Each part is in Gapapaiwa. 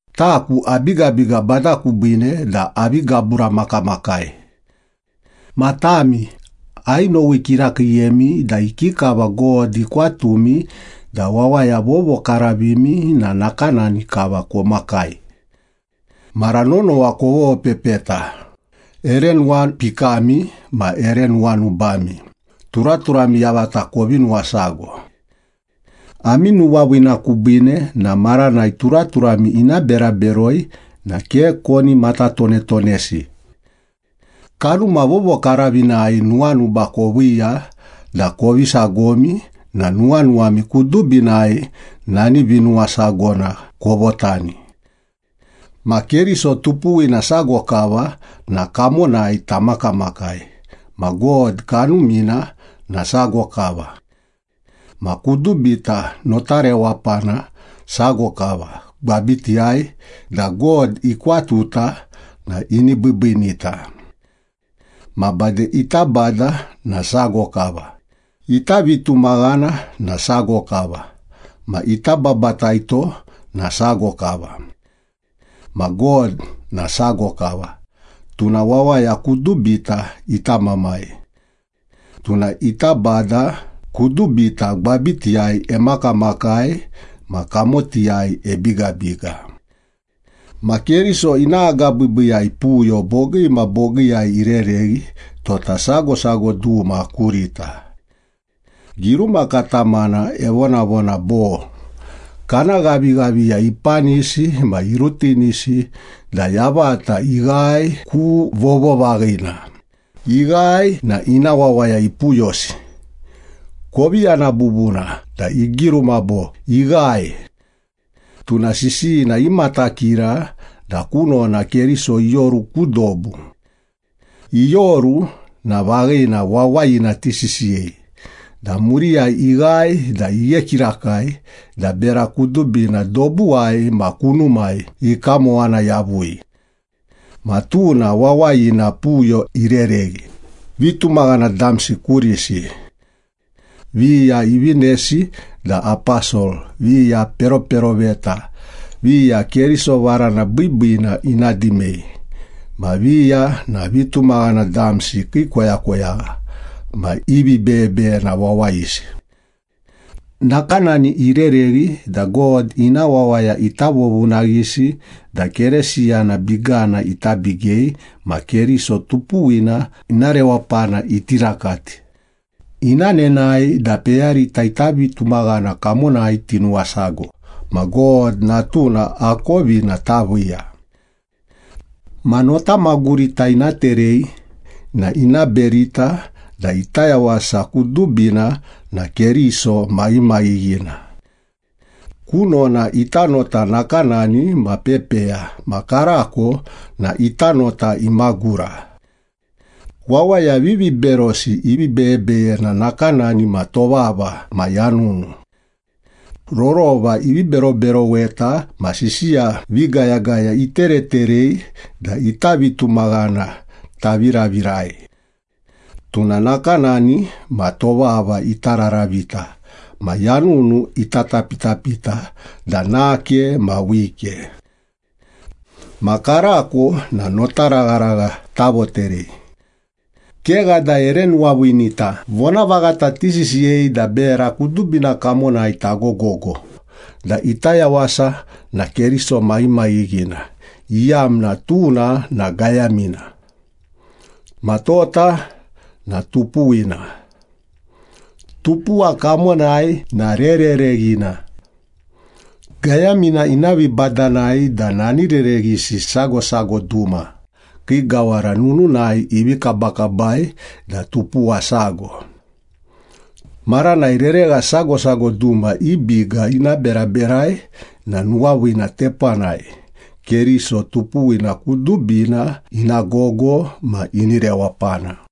Taku abigabiga Bada kubiine da avi gaburamakamakai. Ma tami, ainowi kirakiiyemi da ikikava God ikwatumi da wawaya vovokaravimi na nakanani kava komakai. Mara nonowa kovopepeta, ere nuwapikami ma ere nuwanubami turaturami yavata kovi nuwasago. Ami nuwaviina kubiine na maranai turaturami ina bera beroi na ke koni matatonetonesi. Kanuma Vovokaravinai nuwanuba koviiya da kovi sagomi na nuwanuwami kudubinai nani vinuwasagona kovotani. Ma Keriso tupuwina sago kava na kamonai tamakamakai, ma God Kanumina na sago kava. Ma kudubita nota rewapana sago kava gwabitiyai da God ikwatuta na ini biibiinita. Ma bade, ita Bada na sago kava, ita vitumaghana na sago kava ma ita babataito na sago kava. Ma God na sago kava, tuna wawaya kudubita ita Mamai. Tuna ita Bada, kudubita gwabitiyai emakamakai ma kamotiyai ebigabiga. Ma Keriso ina agabiibiiyai puyo bogii ma bogiiyai irereghi tota sago sago duma kurita. Giruma katamana evonavona bo, “Kana ghavighaviya ipanisi ma irutinisi da yavata ighae ku vovovaghina, ighae na ina wawaya ipuyosi.” Kovi yana bubuna da igiruma bo, “Ighae.” Tuna sisiyina imatakira da kunona Keriso ioru ku dobu. Ioru na vaghina wawayina tisisiyei da muriyai ighae da ighe kirakai da bera kudubina dobuwai ma kunumai ikamowana yavui. Ma tuna wawayina puyo irereghi vitumaghana damsi kurisi. Viya ivinesi da aposol, viya peroperoveta, viya Keriso varana biibiina ina dimei, ma viya na vitumaghana damsi kii koyakoyagha ma i vibeyebeyena wawayisi. Nakanani irereghi da God ina wawaya ita vovunaghisi da Keresiyana bigana ita bigei ma Keriso tupuwina ina rewapana iti rakati, ina nenae da peyarita ita vitumaghana kamonai tinuwasago, ma God Natuna akovina taviiya. Ma notamagurita ina terei na ina berita da ita yawasa kudubina na Keriso maghimaghighina. Kunona ita nota nakanani ma pepeya ma karako na ita nota imagura. Wawaya viviberosi i vibeyebeyena nakanani ma tovava ma yanunu. Rorova ivi beroberoweta ma sisiya vigayagaya itereterei da ita vitumaghana taviravirai. Tuna nakanani ma tovava ita raravita ma yanunu ita tapitapita da nake ma wike. Ma karako na notaragharagha tavoterei. Kegha da ere nuwaviinita vonavaghata tisisiyei da bera kudubina kamonai tagogo da ita yawasa na Keriso maghimaghighina, iyamna tuna na gayamina. Ma tota na tupuwina. Tupuwa kamonai na rerereghina. Gayamina ina vibadanai da nani rereghisi sago sago duma kii gawara nununai ivi kabakabai da tupuwa sago. Maranai reregha sago sago duma i biga ina beraberai na nuwaviina tepanai Keriso tupuwina kudubina ina gogo ma ini rewapana.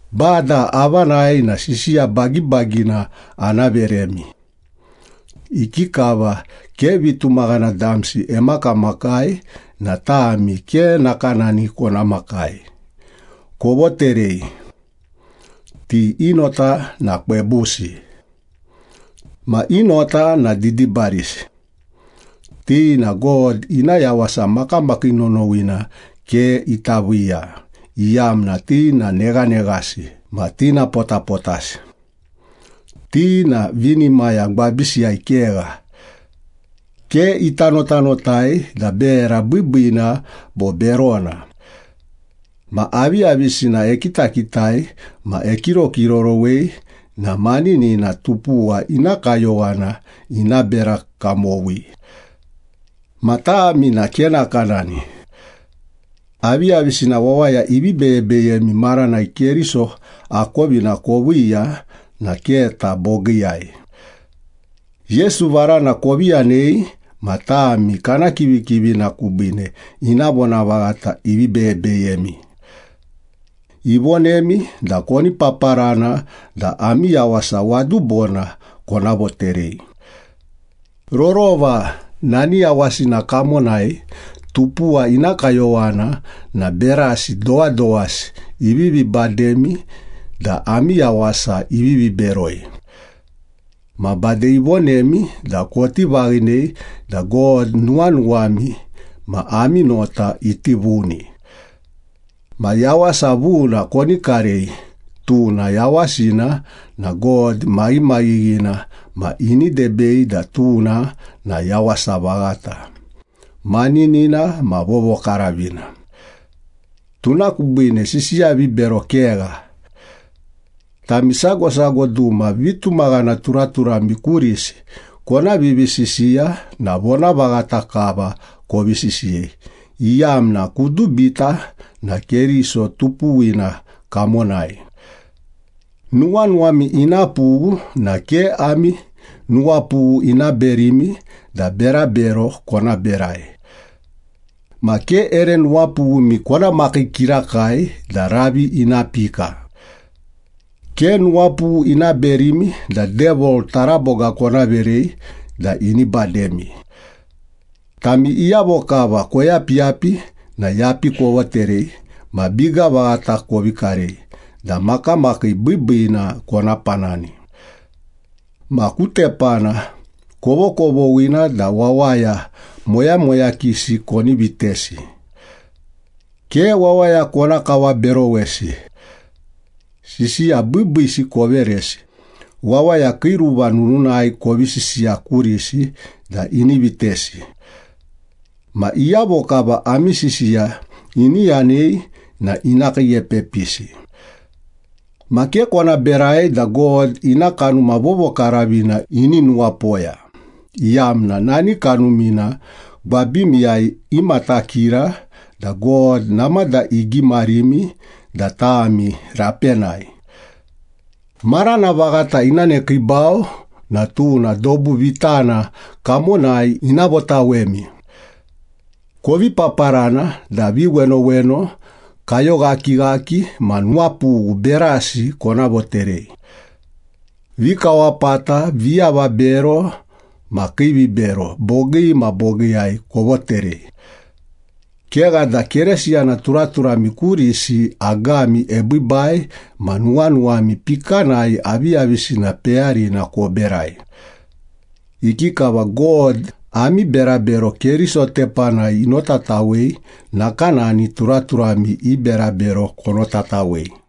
Bada avanai na sisiya bagibagina ana veremi. Ikikava ke vitumaghana damsi emakamakai na tami ke nakanani kona makai, kovoterei. Ti i nota na kwebusi. Ma i nota na didibarisi. Ti na God ina yawasa makamakii nonowina ke ita viiya, iyamna ti na neghaneghasi ma tinapotapotasi. Ti na vinimaya gwabisiyai kegha. Ke ita notanotai da bera biibiina bo berona. Ma aviyavisina ekitakitai ma ekirokirorowei na maninina tupuwa ina kayowana ina bera kamowi. Ma tami na ke nakanani. Aviyavisina wawaya ivi beyebeyemi maranai Keriso akovina koviiya na keta bogiiyai. Yesu varana kovi yanei ma tami kana kivikivina kubiine ina vonavaghata ivi beyebeyemi. Ivonemi da koni paparana da ami yawasa wadubona kona voterei. Rorova nani yawasina kamonai tupuwa ina kayowana na berasi dowadowasi ivivi bademi da ami yawasa ivivi beroi. Ma bade ivonemi da koti vaghinei da God nuwanuwami ma ami nota iti vuni. Ma yawasa vuna koni karei, tuna yawasina na God maghimaghighina ma ini debei da tuna na yawasa vaghata, maninina ma vovokaravina. Tuna kubiine sisiya vibero kegha. Tami sago sago duma vitumaghana turaturami kurisi kona vivisisiya na vonavaghata kava kovi sisiyei, iyamna kudubita na Keriso tupuwina kamonai. Nuwanuwami ina pughu na ke ami nuwapughu ina berimi da berabero kona berai. Ma ke ere nuwapughumi kona makii kirakai da ravi ina pika. Ke nuwapughu ina berimi da Devil taraboga kona verei da ini bademi. Tami iyavo kava koyapiyapi na yapi kovoterei ma biga vaghata kovi karei da makamakii biibiina kona panani. Ma ku tepana kovokovoghina da wawaya moyamoyakisi koni vitesi. Ke wawaya kona kawaberowesi. Sisiya biibiisi koveresi, wawaya kii ruva nununai kovi sisiya kurisi da ini vitesi. Ma iyavo kava ami sisiya ini yanei na ina kiiepepisi. Ma ke kona berai da God ina Kanuma Vovokaravina ini nuwapoya, iyamna nani Kanumina gwabimiyai imatakira da God namada igimarimi da tami rapenai. Marana vaghata ina nekiibau na tuna dobu vitana kamonai ina votawemi. Kovi paparana da viwenoweno, kayoghakighaki ma nuwapughu berasi kona voterei. Vikawapata, viavabero, ma kiivibero bogii ma bogiiyai kovoterei. Kegha da Keresiyana turaturami kurisi agami ebiibai ma nuwanuwami pikanai aviyavisina peyarina koberai. Ikikava God ami berabero Keriso tepanai inotatawei, nakanani turaturami i berabero konotatawei.